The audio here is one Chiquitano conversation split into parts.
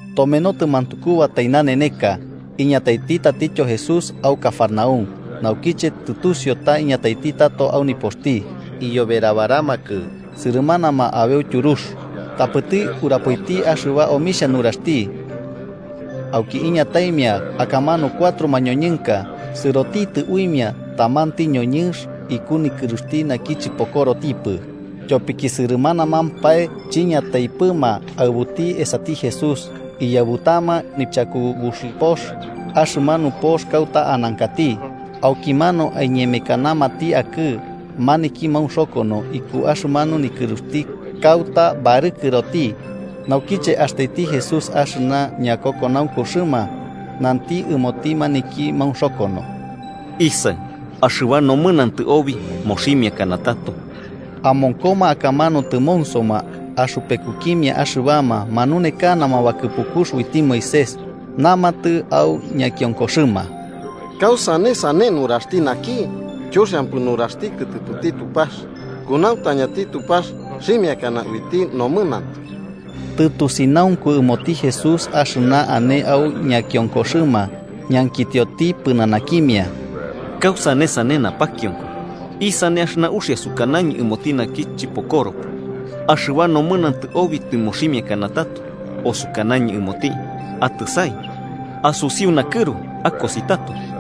Tomenotɨ mantukubatai naneneka, iñataiti tatityo Jesús au Cafarnaúm. Naukiche tɨtusiu ta tiñataiti tato au nipoxti, iyoberabaramakɨ sɨrɨmanama abeu tyurux. Tapɨti urapoiti axɨba omixhia nuraxti. Auki iñataimia akamanu cuatro mañoñɨnka. Sɨrotitɨ uimia tamanti ñoñɨnx iku nikɨruxti naki chɨpokorotipɨ. Tyopi sɨrɨmanamampae chiñataipɨma aɨbuti esati Jesús, iyaɨbutama nichakubuxipox axɨmanu pox kauta anankati, aukimanu aiñemekanamati akɨ'ɨ maniki maunxokono iku axɨmanu nikɨruxti kauta barɨkɨroti. Naukiche astaiti Jesús axɨna ñakokonaunkuxɨma, nanti ɨmoti maniki maunxokono: –Isaɨ, axɨba nomɨnantɨ obi moximiakana tato. Amonkoma akamanu tɨmonsoma axɨpekukimia axɨbama manunekanama bakɨpukux uiti Moisés, namatɨ au ñakionkoxɨma: “¿Kausane sane nuraxti naki? Chuxiampɨ nuraxti kɨtɨpɨti Tupax. Kunauntañati Tupax xhimiakana uiti nomɨnantɨ.” Tɨtusinaunku ɨmoti Jesús axɨna ane au ñakionkoxɨma, ñankitioti pɨnanakimia: –¿Kausane sane napakionko? ¿Isane axɨna uxia, sukanañɨ ɨmoti naki chɨpokoropɨ: ‘Axɨba nomɨnantɨ obi tɨmoximiakana tato’, o sukanañɨ ɨmoti: ‘Atɨsai, asusiu nakɨru akosi tato’?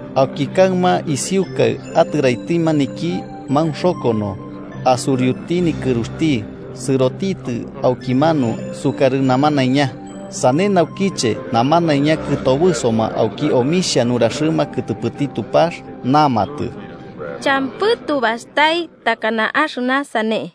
Auki kaɨma isiukai atɨraiti maniki maunxokono, asuriuti nikɨruxti sɨrotitɨ aukimanu, sukarɨ namanaiña. Sane naukiche, namanaiña kɨtobɨsoma auki omixhia nuraxɨma kɨtɨpɨti Tupax, namatɨ: –Champɨ tubastai takana axɨna sane.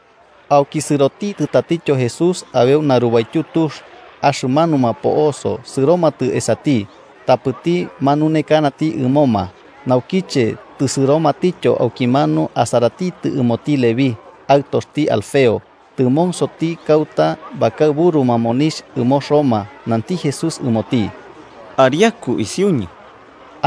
Auki sɨrotitɨ tatityo Jesús abeu narubaityu tux. Axɨmanuma po'oso sɨromatɨ esati, tapɨti manunekanati ɨmoma. Naukiche tɨsɨromatityo aukimanu asaratitɨ ɨmoti Leví, aɨtoxti Alfeo, tɨmonsoti kauta bakaɨburuma monixh ɨmo Roma. Nanti Jesús ɨmoti: –Ariaku isiuñɨ.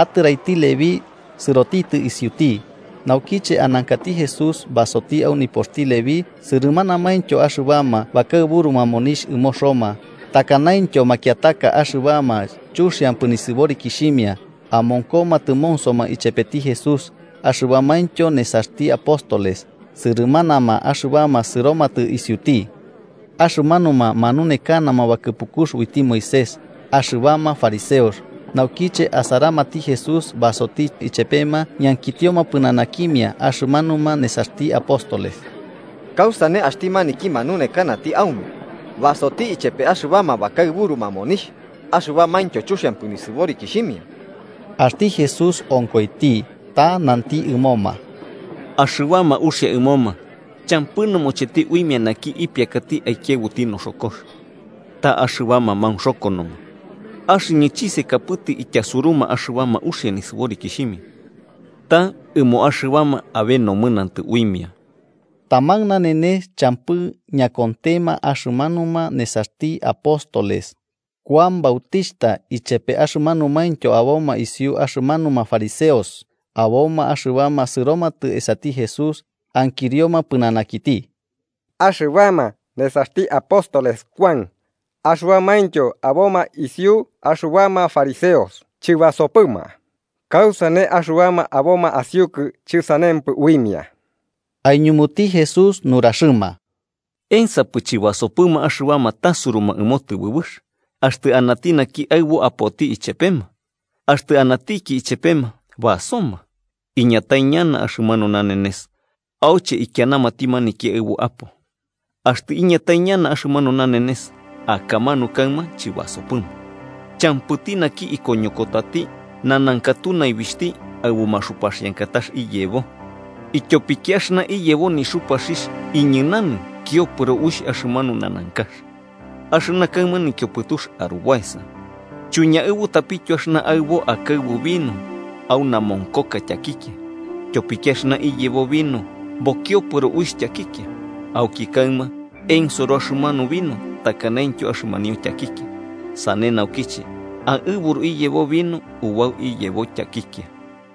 Atɨraiti Leví sɨrotitɨ isiuti. Naukiche anankati Jesús basoti au nipoxti Leví, sɨrɨmanamaintyo axɨbama bakaɨburuma monixh ɨmo Roma, takanaintyo makiataka axɨbama chuxiampɨ nisɨborikixhimia, amonkoma tɨmonsoma ichepeti Jesús axɨbamaintyo nesaxti apóstoles, sɨrɨmanama axɨbama sɨromatɨ isiuti. Axɨmanuma manunekanama bakɨpukux uiti Moisés, axɨbama fariseos, naukiche asaramati Jesús basoti ichepema, ñankitioma pɨnanakimia axɨmanuma nesaxti apóstoles: –¿Kausane axti maniki manunekanati aume basoti ichepe axɨbama bakaɨburuma monixh axɨbamaintyo chuxiampɨ nisɨborikixhimia? Axti Jesús onkoiti, ta nanti ɨmoma: –Axɨbama uxia ɨmoma champɨ nɨmocheti uimia naki ipiakati aikiaɨbuti noxokox, ta axɨbama maunxokonoma. Axɨñɨ chisekapɨtɨ ityasuruma axɨbama uxia nisɨborikixhimia, ta ɨmo axɨbama abe nomɨnantɨ uimia. Taman nanenes champɨ ñakontema axɨmanuma nesaxti apóstoles Kuan Bautixhta ichepe axɨmanumaintyo aboma isiu axɨmanuma fariseos, aboma axɨbama sɨromatɨ esati Jesús ankirioma pɨnanakiti: –Axɨbama nesaxti apóstoles Kuan axɨbamaintyo aboma isiu axɨbama fariseos chɨbasopɨma: ¿kausane axɨbama aboma asiukɨ chɨsanempɨ uimia? Aiñumuti Jesús nuraxɨma: –¿Ensapɨ chɨbasopɨma axɨbama tasuruma ɨmo tɨbɨbɨx, axtɨ anati naki aɨbo apoti ichepema? Axtɨ anatiki ichepema, basoma. Iñatai ñana axɨmanu nanenes auche aikianamati maniki aɨbo apo. Axtɨ iñatai ñana axɨmanu nanenes, akamanu kaɨma chɨbasopɨma. “Champɨti naki ikoñokotati nanankatu naibixhti aɨbu maxupaxiankatax iyebo, ityopiki axɨna iyebo nixupaxixh iñɨnanɨ kiopɨro uixh axɨmanu nanankax, axɨna kaɨma nikiopɨtux arubaesa. Chuiñaɨbutapityo axɨna aɨbo akaɨbu vino au namonkoka tyakikia, tyopiki axɨna iyebo vino bokiopɨro uixh tyakikia, auki kaɨma ensoro axɨmanu vino takanaintyo axɨmanio tyakikia. Sane naukiche aɨburu iyebo vino ubau iyebo tyakikia.”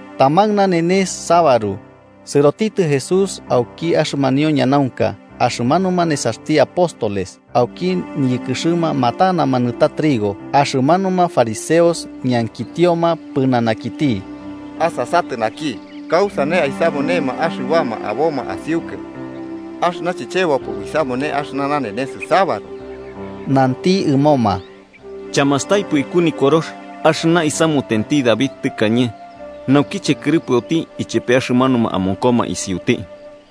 Taman nanenes sabaru, sɨrotitɨ Jesús auki axɨmanio ñanaunka, axɨmanuma nesaxti apóstoles, auki niyɨkɨxɨma, matanama nɨta trigo. Axɨmanuma fariseos ñankitioma pɨnanakiti: –Asasatɨ naki, ¿kausane aisamunema axɨbama aboma asiukɨ axɨna chichebopɨ uisamune axɨna nanenes sabaru? Nanti ɨmoma: –¿Chamastaipɨ iku Nikorox axɨna isamutenti David tɨkañe naukiche kɨrɨpɨoti ichepe axɨmanuma amonkoma isiuti?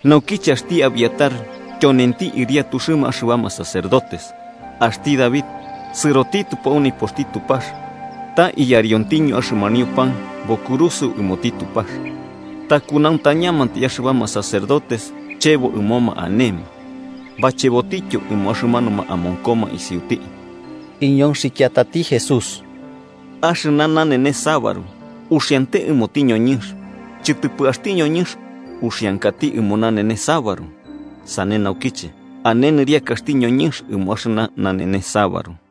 Naukiche axti Abiatar tyonenti ɨriatuxɨma axɨbama sacerdotes, axti David sɨrotitɨpo au nipoxti Tupax ta iyariontiño axɨmanio pan bokurusɨo ɨmoti Tupax, ta kunauntañamantai axɨbama sacerdotes chebo ɨmoma anema. Bachebotityo ɨmo axɨmanuma amonkoma isiuti. Iñonxikiatati Jesús: –Axɨna nanenes sabaru uxiante ɨmoti ñoñɨnx, chɨtɨpɨ axti ñoñɨnx uxiankati ɨmo nanenes sabaru. Sane naukiche, ane nɨriakaxti ñoñɨnx ɨmo axɨna nanenes sabaru.